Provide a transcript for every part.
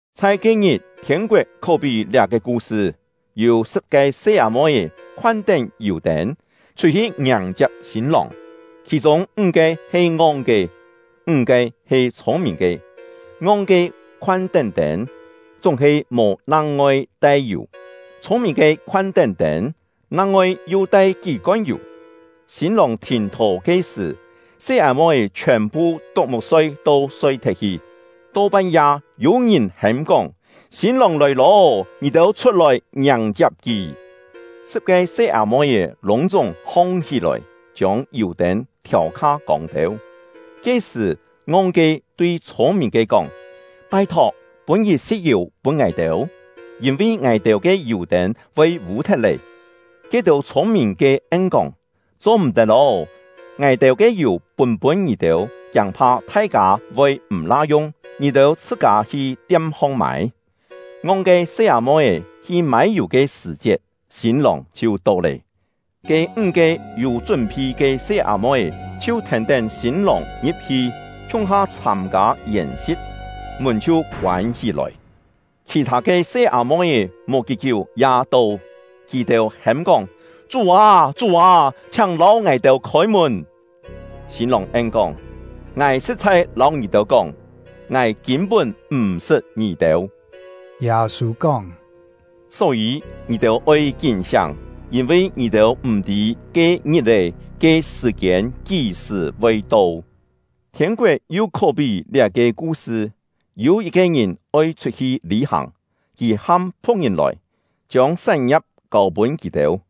“Chhai ke-ngit, thiên-koet khó-pí liá-ke ku-sṳ: Yû sṳ̍p-ke se-â-moi-é khoan-tén yù-tên, chhut-hi ngiàng-chiap sîn-lòng. Khì-chûng ńg-ke he ngong-ke, ńg-ke he chhûng-mìn-ke. Ngong-ke khoan-tén tên, chúng-he mò nang-ngoi tai yù; chhûng-mìn-ke khoan-tén tên, nang-ngoi yu tai kí-kon yù. Sîn-lòng thìn-thò ke sṳ̀, se-â-moi-é chhiòn-phu tuk-muk-soi to soi-thet-hi. “To pan-ya, yû-ngìn hêm-kóng: ‘Sîn-lòng lòi lô, ngì-têu chhut-lòi ngiàng-chiap kì!’ Sṳ̍p-ke se-â-moi-é lûng-chúng hong-hí-lòi, chiông yù-tên thiâu kha kông têu. Ke-sṳ̀, ngong-ke tui chhûng-mìn-ke kóng: ‘Pai-thok, pûn yit-si̍t yù pûn ngài-têu, yîn-vi ngài-têu ke yù-tên voi vû-thet lé!’ Ke-têu chhûng-mìn-ke en-kóng: ‘Cho-m̀-tet ô, ngài-têu ke yù pûn-pûn ngì-têu, kiâng-pha thai-kâ voi m̀-la yung; ngì-têu chhṳ-kâ hi tiam-hong mâi.’ Ngong-ke se-â-moi-é hi mâi yù ke sṳ̀-chiet, sîn-lòng chhiu to lé. Ke ńg-ke yû chún-phi ke se-â-moi-é chhiu thèn-tén sîn-lòng ngi̍p-hi, khiung-ha chhâm-kâ yèn-si̍t; mùn chhiu koân hí-lòi. “Khì-thâ ke se-â-moi-é mò kí-kiú ya to; kì-têu hêm-kóng: ‘Chú â, Chú â! Chhiáng lâu ngài-têu khôi-mùn!’ Sîn-lòng en-kóng: ‘Ngài sṳ̍t-chhai lâu ngì-têu kóng, ngài kîn-pún m̀ sṳt ngì-têu.’” Yâ-sû kóng: “Só-yî, ngì-têu oi kín-siáng, yîn-vi ngì-têu m̀-tî ke ngit-è, ke sṳ̀-kiên kí-sṳ̀ voi to. “Thiên-koet yu khó-pí liá-ke ku-sṳ: Yû yit-ke ngìn oi chhut-hi lî-hàng, kì ham phu̍k-ngìn lòi, chiông sán-ngia̍p kâu-pûn kì-têu.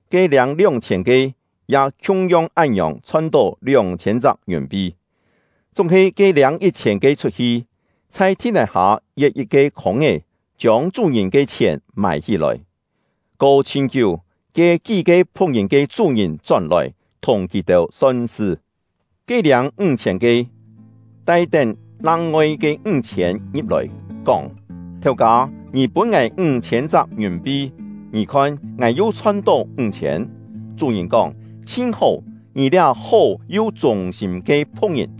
Ke liâng lióng-chhiên ke, ya khiung-yong án-ngiòng chhon-tó lióng-chhiên chak ngiùn-pi. Chúng-he ke liâng yit-chhiên ke chhut-hi, chhai thi-nài-hâ yet yit-ke khûng-é, chiông chú-ngìn ke chhièn mài-hí-lòi. “Ko chhin kiú, ke kí-ke phu̍k-ngìn ke chú-ngìn chón-lòi, thùng kì-têu son-sṳ. Ke liâng ńg-chhiên ke, tai-tén nang-ngoi ke ńg-chhiên ngi̍p-lòi, kóng: ‘Thèu-kâ, ngì pûn ngài ńg-chhiên chak ngiùn-pi; ngì khon, ngài yu chhon-tó ńg-chhiên.’ Chú-ngìn kóng: ‘Chhin hó, ngì liá hó yu chûng-sîm ke phu̍k-ngìn!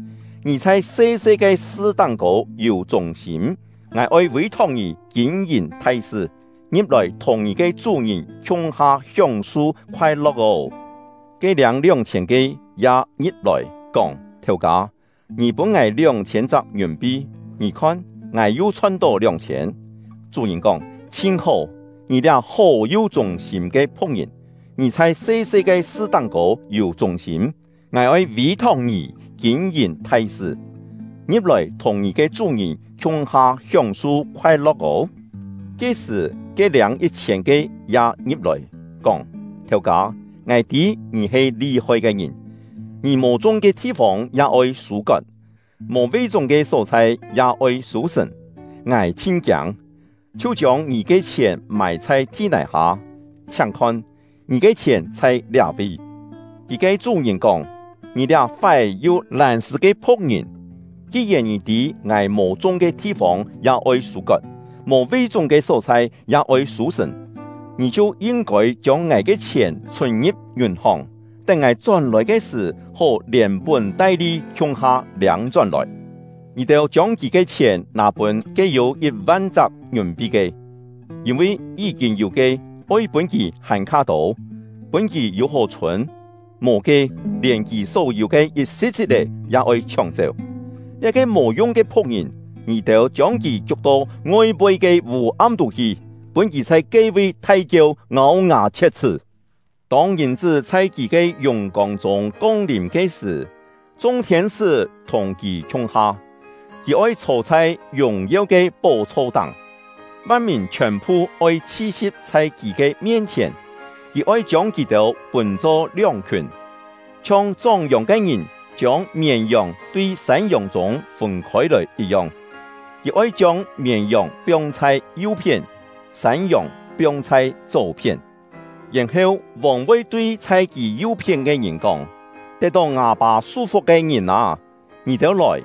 Ngì chhai se-se ke sṳ táng-kô yû chûng-sîm, ngài oi vî-thok ngì kîn-yìn thai sṳ. Ngi̍p-lòi thùng ngì ke chú-ngìn khiung-ha hióng-su khoai-lo̍k ô!’ “Ke liâng lióng-chhiên ke, ya ngi̍p-lòi, kóng: ‘Thèu-kâ, ngì pûn ngài lióng-chhiên chak ngiùn-pi; ngì khon, ngài yu chhon-tó lióng-chhiên.’ Chú-ngìn kóng: ‘Chhin hó, ngì liá hó yu chûng-sîm ke phu̍k-ngìn! Ngì chhai se-se ke sṳ táng-kô yû chûng-sîm, ngài oi vî-thok ngì kîn-yìn thai sṳ. Ngi̍p-lòi thùng ngì ke chú-ngìn khiung-ha hióng-su khoai-lo̍k ô!’ “Ke-sṳ̀, ke liâng yit-chhiên ke ya ngi̍p-lòi, kóng: ‘Thèu-kâ, ngài tî ngì he li-hoi ke ngìn; ngì mò chung ke thi-fông ya oi sû-kot, mò ve-chúng ke só-chhai ya oi sû-sṳ̀n. Ngài chhin kiâng, chhiu chiông ngì ke chhièn mài chhai thi-nài-hâ. Chhiáng khon, ngì ke chhièn chhai liá-vi.’ “Kì ke chú-ngìn kóng: ‘Ngì liá fái yu lân-sṳ̂ ke phu̍k-ngìn! Ki-yèn ngì tî ngài mò chung ke thi-fông ya oi sû-kot, mò ve-chúng ke só-chhai ya oi sû-sṳ̀n, ngì chhiu yin-kôi chiông ngài ke chhièn chhùn-ngi̍p ngiùn-hòng, tén ngài chón-lòi ke sṳ̀, hó lièn-pún-tai-li khiung-ha liâng-chón-lòi. Ngì-têu chiông kì ke chhièn nâ pûn ke yû yit-van chak ngiùn-pi ke. Yîn-vi yí-kîn yû ke, oi pûn kì hàn-kha tô, pûn kì yû-hó chhûn; mò ke, lièn kì só-yû ke yit-si̍t-si̍t-é ya oi chhióng-chéu. Liá-ke mò yung ke phu̍k-ngìn, ngì-têu chiông kì kiuk-to ngoi-poi ke vû-am tú hi; pûn kì chhai ke-vi thai-kieu, ngâu-ngà chhiet-chhṳ́.’ “Tông Ngìn-chṳ́ chhai kì ke yùng-kông chûng kong-lìm ke sṳ̀, chung thiên-sṳ́ thùng kì khiung-ha, kì oi chhô chhai yùng-yeu ke pó-chho-táng; van-mìn chhiòn-phu oi chhi-si̍p chhai kì ke mien-chhièn. Kì oi chiông kì-têu pûn-cho lióng-khiùn, chhiong chóng-yòng ke ngìn chiông mièn-yòng tui sân-yòng chûng pûn-khôi-lòi yit-yong. Kì oi chiông mièn-yòng piong chhai yu-phién, sân-yòng piong chhai chó-phién. Yèn-heu, vòng voi tui chhai kì yu-phién ke ngìn kóng: ‘Tet-tó ngâ Pâ su-fuk ke ngìn â, ngì-têu lòi!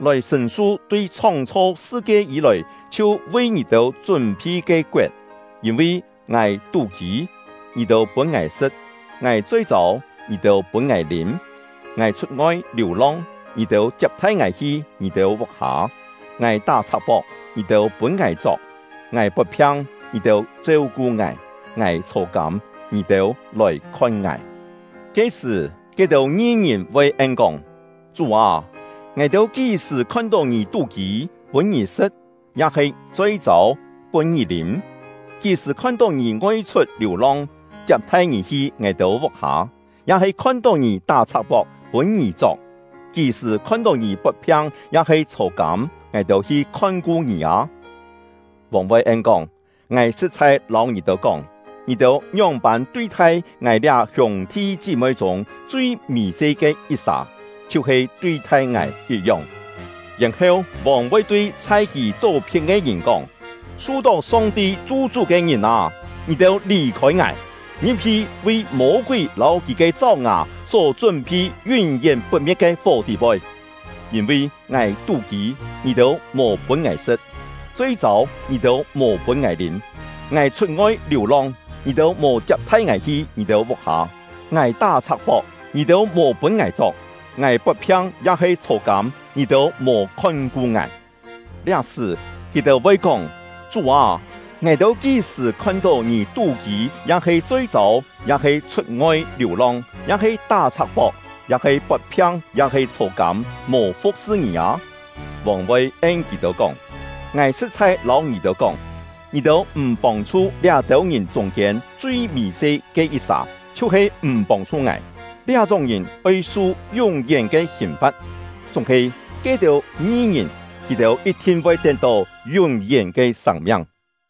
Lòi sṳ̀n-su tui chhóng-chho sṳ-kie yî-lòi chhiu vi ngì-têu chún-phi ke koet. Yîn-vi ngài tú-kî, ngì-têu pûn ngài sṳ̍t; ngài choi-châu, ngì-têu pûn ngài lîm; ngài chhut-ngoi liù-long, ngì-têu chiap-thai ngài hi ngì-têu vuk-hâ; ngài tá-chhak-pok, ngì-têu pûn ngài chok; ngài pot-phiang, ngì-têu cheu-ku ngài; ngài chhô-kâm, ngì-têu lòi khon ngài.’ “Ke-sṳ̀, ke-têu ngi-ngìn voi en-kóng: ‘Chú â, ngài-têu kí-sṳ̀ khon-tó ngì tú-kî, pûn ngì sṳ̍t; ya-he choi-châu, pûn ngì lîm? Kí-sṳ̀ khon-tó ngì chhut-ngoi liù-long, chiap-thai ngì hi ngài-têu vuk-hâ; ya-he khon-tó ngì tá-chhak-pok, pûn ngì chok? Kí-sṳ̀ khon-tó ngì pot-phiang ya-he chhô-kâm, ngài-têu hi khon-ku ngì â?’ Vòng voi en-kóng: ‘Ngài sṳ̍t-chhai lâu ngì-têu kóng, ngì-têu ngióng-pân tui-thai ngài liá hiûng-thi chí-moi chûng chui mì-se ke yit-sà, chhiu-he tui-thai ngài yit-yong!’ “Yèn-heu, vòng voi tui chhai kì chó-phién ke ngìn kóng: ‘Su-tó Song-ti chu-chú ke ngìn â, ngì-têu lì-khôi ngài! Ngi̍p-hi vi Mô-kúi lâu kì ke cháu-ngà só chún-phi yún-yén put-me̍t ke fó tî-poi! Yîn-vi ngài tú-kî, ngì-têu mò pûn ngài sṳ̍t; choi-châu, ngì-têu mò pûn ngài lîm; ngài chhut-ngoi liù-long, ngì-têu mò chiap-thai ngài hi ngì-têu vuk-hâ; ngài tá-chhak-pok, ngì-têu mò pûn ngài chok; ngài pot-phiang ya-he chhô-kâm, ngì-têu mò khon-ku ngài.’ “Liá-sṳ̀, kì-têu voi kóng: ‘Chú â, ngài-têu kí-sṳ̀ khon-tó ngì tú-kî ya-he choi-châu, ya-he chhut-ngoi liù-long, ya-he tá-chhak-pok, ya-he pot-phiang ya-he chhô-kâm, mò fu̍k-sṳ ngì â?’ Vòng voi en kì-têu kóng: ‘Ngài sṳ̍t-chhai lâu ngì-têu kóng, ngì-têu m̀ pông-chhu liá-têu ngìn chûng-kiên chui mì-se ke yit-sà, chhiu-he m̀ pông-chhu ngài.’ Liá-chúng ke ngìn oi su yún-yén ke hìn-fa̍t; chúng-he ke-têu ngi-ngìn, kì-têu yit-thin voi tet-tó yún-yén ke sâng-miang.”